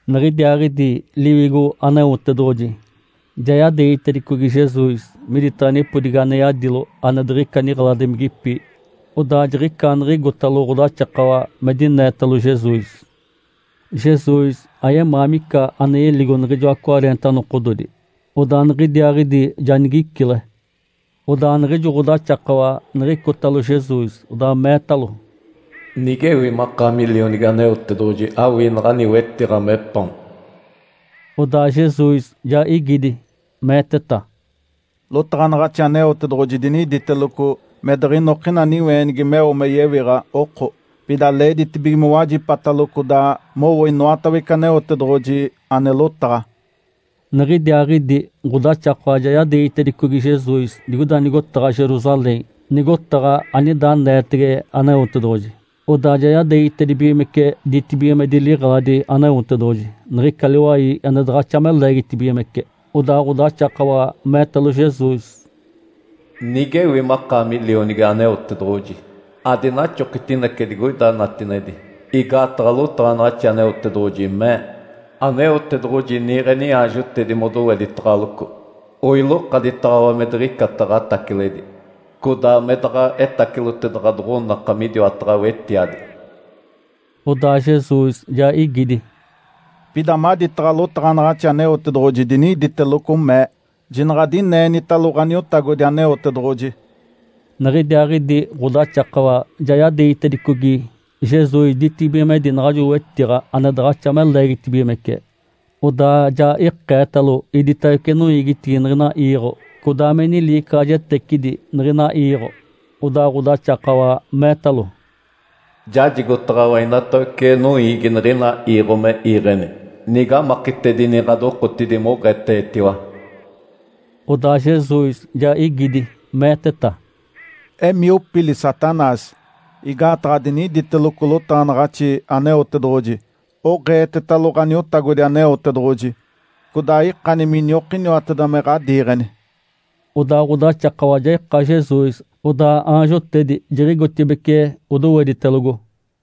Niɡ̶idiaaɡ̶idi Liwigo Aneotedoɡ̶oji ja yadeegitedicogi Jesus miditaɡ̶a nipodigi ane yadilo ane diɡ̶ica niɡ̶eladimigipi, odaa jiɡ̶icaaniɡ̶igotalo ɡ̶odaxakawa me dinetalo Jesus. Jesus ayemaa mica ane yeligo niɡ̶ijoa cwareenta nokododi, odaa niɡ̶idiaaɡ̶idi ja nigicile. Odaa niɡ̶ijo ɡ̶odaxakawa, niɡ̶icotalo Jesus, odaa meetalo, “Nigewi makaami Lionigi Aneotedoɡ̶oji, awii naɡ̶ani wetiɡ̶a me paon.” Odaa Jesus ja igidi, meeteta, “Lotaɡ̶anaɡ̶axi Aneotedoɡ̶oji diniditeloco, ‘Me diɡ̶inokina niweenigi meo me yewiɡ̶a oko. Pida leeditibige mowajipatalo codaa mowo inoatawece Aneotedoɡ̶oji ane lotaɡ̶a.’” Niɡ̶idiaaɡ̶idi ɡ̶odaxakawa ja yadeegitedicogi Jesus digoida nigotaɡ̶a Jerusalém, nigotaɡ̶a anida aneetege Aneotedoɡ̶oji. Odaa ja yadeegitedibigimece ditibigimedi liɡ̶eladi Aneotedoɡ̶oji, niɡ̶ica liwai ane daɡ̶axa me leegitibigimece. Odaa ɡ̶odaxakawa meetalo Jesus, “Nigewi makaami Lionigi Aneotedoɡ̶oji, adinaxokitinece digoida natinedi, igaataɡ̶a lotaɡ̶anaɡ̶axi Aneotedoɡ̶oji mee, ‘Aneotedoɡ̶oji niiɡ̶e niaanjotedi modoweditaɡ̶aloco. Oilokaditaɡ̶awa me diɡ̶icata ɡ̶ataciledi, codaa me daɡ̶a etaciloteda ɡ̶adoɡ̶onaka midiwataɡ̶a wetiadi.’” Odaa Jesus ja igidi, “Pida maditaɡ̶a lotaɡ̶anaɡ̶axi Aneotedoɡ̶oji diniditeloco, mee, ‘Jinaɡ̶a adineenitalo Ǥaniotagodi Aneotedoɡ̶oji!’” Niɡ̶idiaaɡ̶idi ɡ̶odaxakawa ja yadeegitedicogi Jesus ditibigimedi naɡ̶ajo wetiɡ̶a ane daɡ̶axa me leegitibigimece, odaa ja ikeetalo iditawece noiigitigi niɡ̶ina iiɡ̶o, codaa me niliicaɡ̶ajetecidi niɡ̶ina iiɡ̶o. Odaa ɡ̶odaxakawa meetalo, “Jajigotaɡ̶awa inatawece noiigi niɡ̶ina iiɡ̶o me iiɡ̶eni, nige amakitedini ɡ̶adokotidi moɡ̶eetetiwa.” Odaa Jesus ja igidi, meeteta, “Emii, opili, Satanás! Igaataɡ̶a diniditeloco lotaɡ̶anaɡ̶axi Aneotedoɡ̶oji, ‘Oɡ̶eetetalo Ǥaniotagodi Aneotedoɡ̶oji, codaa ikani miniokiniwateda me ɡ̶adiiɡ̶eni.’” Odaa ɡ̶odaxakawa ja ika Jesus, odaa aanjotedi jiɡ̶igotibeci, odoweditelogo.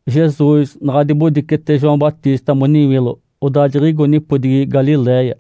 Jesus naɡ̶a dibodicete João Batista moniwilo, odaa jiɡ̶igo nipodigi Galiléia.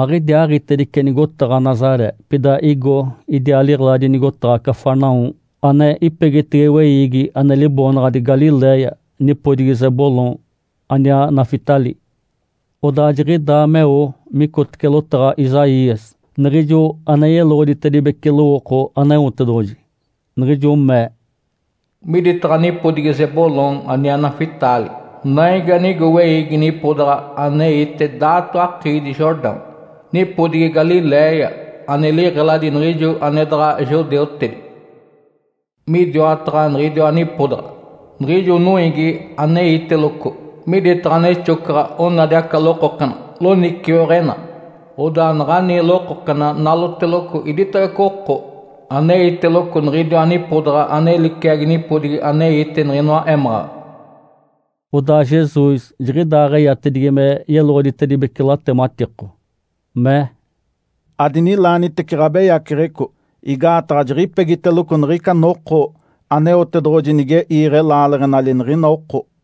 Aɡ̶idiaaɡ̶itedice nigotaɡ̶a Nazaré, pida igo idiaa liɡ̶eladi nigotaɡ̶a Cafarnaum, ane ipegitege weiigi ane liboonaɡ̶adi Galiléia, nipodigi Zebulom aniaa Naftali. Odaa jiɡ̶idaa meo micotece lotaɡ̶a Isaías, niɡ̶ijo ane yeloɡ̶oditedibece lowooko Aneotedoɡ̶oji, niɡ̶ijo mee, “Miditaɡ̶a nipodigi Zebulom aniaa Naftali, naigi anigo weiigi nipodaɡ̶a aneite daato akiidi Jordão, nipodigi Galiléia ane liɡ̶eladi niɡ̶ijo ane daɡ̶a judeutedi. Midiwataɡ̶a niɡ̶idiwa nipodaɡ̶a, niɡ̶ijo noiigi aneiteloco miditaɡ̶a nexocaɡ̶a onadi aca lokokena loniciweɡ̶ena. Odaa naɡ̶ani lokokena naloteloco iditawece oko aneiteloco niɡ̶idiwa nipodaɡ̶a ane liciagi nipodigi aneite niɡ̶inoa émaɡ̶aɡ̶a.” Odaa Jesus jiɡ̶idaaɡ̶eyatedigi me yeloɡ̶oditedibece latematiko, mee, “Adinilaanitece ɡ̶abeyaceɡ̶eco, igaataɡ̶a jiɡ̶ipegiteloco niɡ̶ica noko Aneotedoɡ̶oji nige iiɡ̶e laaleɡ̶enali niɡ̶ina oko.”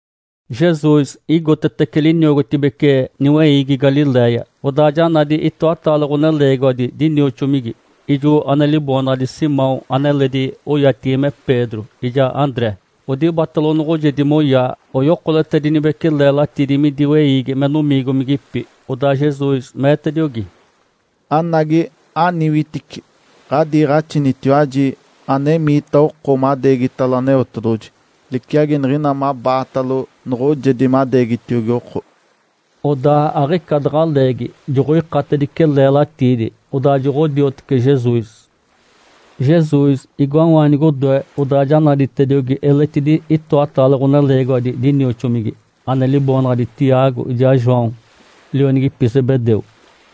Jesus igotetece liniogotibece niweiigi Galiléia, odaa ja nadi itoataale ɡ̶oneleegiwadi dinioxomigi, ijo ane liboonaɡ̶adi Simão (ane eledi oyatigi me Pedro) ijaa André. Odibatalo noɡ̶ojedi moyaa, oyokoletedinibece leelatiidi midi weiigi me nomiigomigipi. Odaa Jesus meetediogi, “Anagi, aniwitici! Ǥadiiɡ̶axinitiwaji anemiita oko madeegitalo Aneotedoɡ̶oji, liciagi niɡ̶ina mabaata noɡ̶ojedi madeegitiogi oko.” Odaa aɡ̶ica daɡ̶a leegi, joɡ̶oikatedice leelatiidi, odaa joɡ̶odiotece Jesus. Jesus igoawaanigi odoe, odaa ja naditediogi eletidi itoataale ɡ̶oneleegiwadi dinioxomigi, ane liboonaɡ̶adi Tiago ijaa João, lionigipi Zebedeu.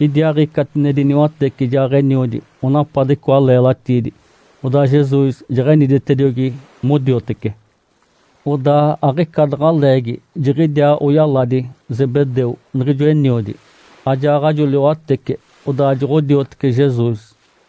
Idiaaɡ̶i catinedi niwatece ijaaɡ̶eniodi, onapade icoa leelatiidi. Odaa Jesus jeɡ̶eniditediogi modiotece. Odaa aɡ̶ica daɡ̶a leegi jidiaa oyaladi Zebedeu, niɡ̶ijo eniodi, ajaaɡ̶ajo liwatece, odaa joɡ̶odiotece Jesus.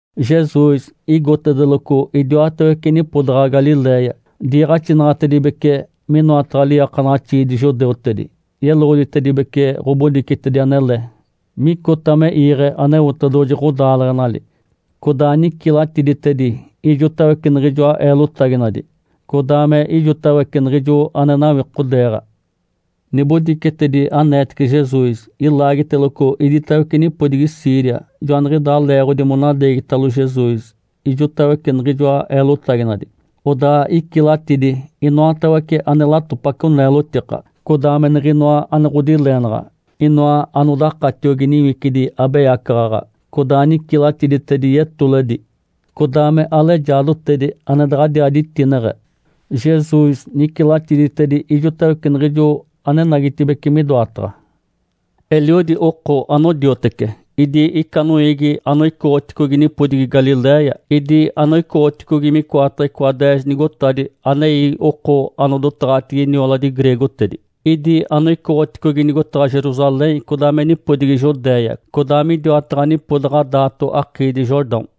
Jesus igotedeloco idiwatawece nipodaɡ̶a Galiléia. Diiɡ̶axinaɡ̶atedibece minoataɡ̶a liiakanaɡ̶axiidi judeutedi. Yeloɡ̶oditedibece ɡ̶obodicetedi anele micota me iiɡ̶e Aneotedoɡ̶oji ɡ̶odaaleɡ̶enali. Codaa nicilatiditedi ijotawece niɡ̶ijoa eelotaginadi, codaa me ijotawece niɡ̶ijo ane nawikodeeɡ̶a. Nibodicetedi aneetece Jesus ilaagiteloco iditawece nipodigi Síria. Joaniɡ̶idaa leeɡ̶odi monadeegitalo Jesus ijotawece niɡ̶ijoa eelotaginadi. Odaa icilatidi inoatawece ane latopaco neelotika, codaa me niɡ̶inoa ane ɡ̶odileenaɡ̶a, inoa anodakatiogi niwicidi abeyacaɡ̶aɡ̶a, codaa nicilatiditedi yetoledi, codaa me alejaadotedi ane daɡ̶adiaa ditineɡ̶e. Jesus nicilatidi ijotawece niɡ̶ijo anenagitibeci midoataɡ̶a. Eliodi oko anodiotece. Idi ica noiigi anoicoɡ̶oticogi nipodigi Galiléia, idi anoicoɡ̶oticogi micoataɡ̶a icoa deez nigotadi anei oko anodotaɡ̶atigi nioladi greegotedi, idi anoicoɡ̶oticogi nigotaɡ̶a Jerusalém, codaa me nipodigi Judéia, codaa midiwataɡ̶a nipodaɡ̶a daato akiidi Jordão.